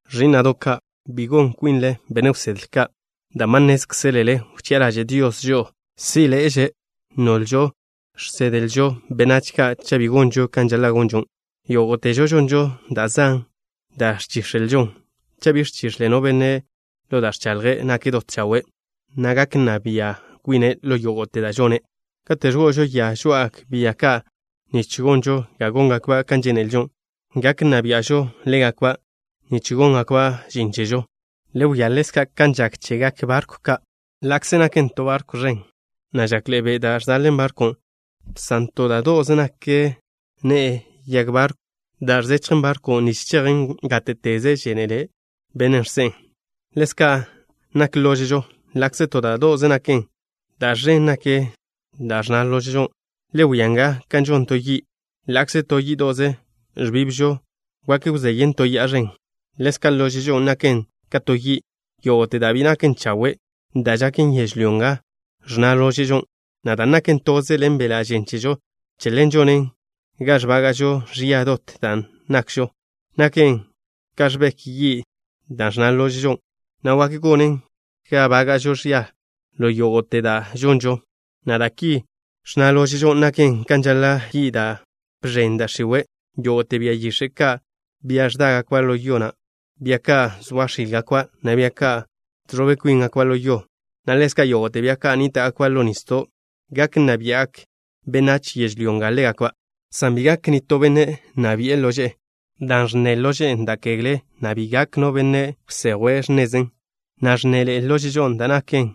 Ẕí'na'do' ka', bi gonte kwinle benne' wsedle ka', dan' ba nnézkzelele wchi'a ḻaže' Dios žo'o zí'ḻe'eže, nolžo žsedlžo benách ka' cha' bi gonžo kan žaḻa' gonžo. Yógo'težo žonžo da' zan da' ẕchíx̱elžon. Cha' bi ẕchix̱le no benne' ḻo da' ẕchaḻje', nake' dot chawe', na' gak nna bia' kwine' ḻo yógo'te da' žone'. Kate' ẕgo'ožo ya žoá'agak bia ka' nich gonžo ga góngakba' kan žénelžo, gak nna bia'žo ḻégakba' nich góngakba' žin chežo. Le wia ḻezka' kan žak chegak barkw ka'. Ḻa'kze nakḻe'e ẕen to barkw, na' žakḻe'e be' da' ẕzejen barkwn', san to da' kwíde'ze nak x̱ne'e yag barkwn' da' ẕzechjen barkwn' nich chejen gáte'teze žénele bennen' žse'en. Ḻezka' nak lóže'žo. Ḻa'kze to da' do'ze naken, da' ẕen naken da' ẕnna lóže'žon'. Le wia nga kan žon to yi'. Ḻa'kze to yí'do'ze ẕbibžo, wak wzeyen to ya'a ẕen. Ḻezka' lóže'žon' naken ka to yi'. Yógo'te da' bi naken chawe' da' žaken yežlyó nga ẕnna lóže'žon', na' dan' naken toze ḻen beḻa' žen chežo, che ḻen žonen ga ẕbaga' ẕia dot da' nakžo. Naken ka ẕbek yi' da' ẕnna lóže'žo, na' wak gonen ga nbága'žo ẕia ḻo yógo'te da' žonžo, na' dan' ki ẕnna lóže'žon', naken kan žaḻa' yi' da' bx̱en da' x̱iwe'. Yógo'te bia yix̱e' ka', bia ẕdágakba' ḻo yo, na' bia ka' zoa x̱ílgakba', na' bia ka' žẕobe kwíngakba' ḻo yo, na' ḻezka' yógo'te bia ka' nníta'gakba' ḻo nisdo', gak nna bia'gak benách yežlyó nga ḻégakba', san bi gak nitó benne' nna bi'e lože'e, dan' ẕnna lóže'žo da' kegle, na' bi gak no benne' wsejwe' x̱nezen, na' ẕnnaḻe'e lóže'žon' da' naken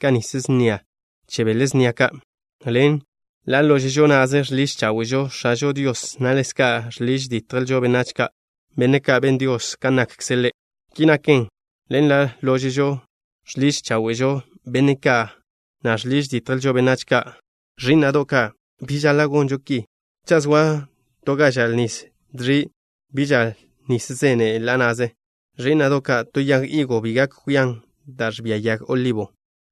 ka nis snia che bele snia ka'. Ḻen ḻa' lóže'žo na'ze žḻiž cháwe'žo X̱ažo Dios, na' ḻezka' žḻiž ditjžo benách ka', benne' ka' ben Dios kan nakkze' Ḻe'. Ki naken, ḻen ḻa' lóže'žon' žḻiž cháwe'žo benne' ka', na' žḻiž ditjžo benne' ka'. Ẕí'na'do' ka', bi žaḻa' gonžo ki. Cha' zoa to ga žal nis dẕi', bi žal nis zene' ḻa' na'ze. Ẕí'na'do' ka', to yag higo bi gak kwian da' ẕbia yag olibo,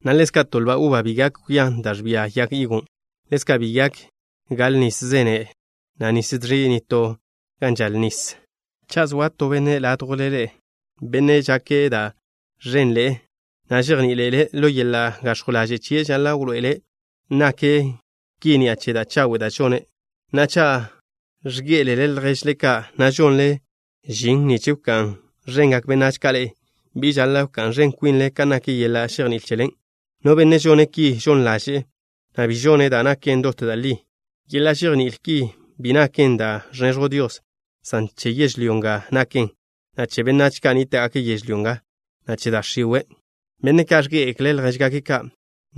na' ḻezka', to lba uba bi gak kwian da' ẕbia yag higon'. Ḻezka', bi gak gal nis zene', na' nis dẕi' nitó gan žal nis. Cha' zoa to benne' ládjwle ḻe'e, benne' žake' da' ẕenḻe'e, na' žejní'iḻe'ele', ḻo yeḻa' gax̱jw ḻaže' chie' žaḻa' wḻoe'ele' nake' ki ni'a che da' chawe' da' žone'. Na'a, cha' ẕgé'elele lježle ka', na' žonle žin nich wká'n ẕengak benách ka' ḻe'e, bi žaḻa' wká'n ẕen kwinle kan nak yeḻa' žejní'il chelen'. No benne' žone' ki žon ḻaže'e, na' bi žone' da' naken dot da' li. Yeḻa' žejní'il ki bi naken da' ẕneẕjw Dios, san che yežlyó nga naken, na' che benách ka' nníta'gake' yežlyó nga, na' che da' x̱iwe'. Benne' ka' ẕgé'egekle' ljéžgake' ka',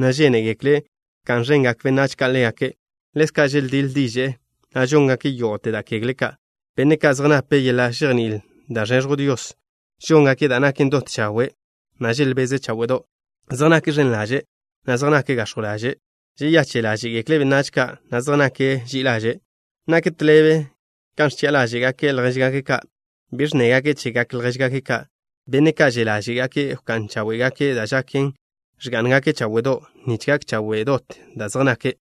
na' žénegekle' wká'n ẕengak benách ka' ḻégake', ḻezka' želdíḻ diže'e, na' žóngake' yógo'te da' kegle ka'. Benne' ka' zej nape' yeḻa' žejní'il da' ẕneẕjw Dios: Žóngake' da' naken dot chawe', na' želbeze' cháwe'do'. Zej nake' ẕen ḻaže', na' zej nake' gax̱jw ḻaže'. Žeyache' ḻáže'gekle' benách ka', na' zej nake' ži'i ḻaže'. Nak tḻebe kan ẕchi'a ḻáže'gake' ljéžgake' ka'. Bi ẕnnégake' chegak ljéžgake' ka'. Benne' ka' že' ḻáže'gake' wká'n cháwe'gake' da' žaken, ẕgá'ngake' cháwe'do', nich gak chawe' dot da' zej nake'.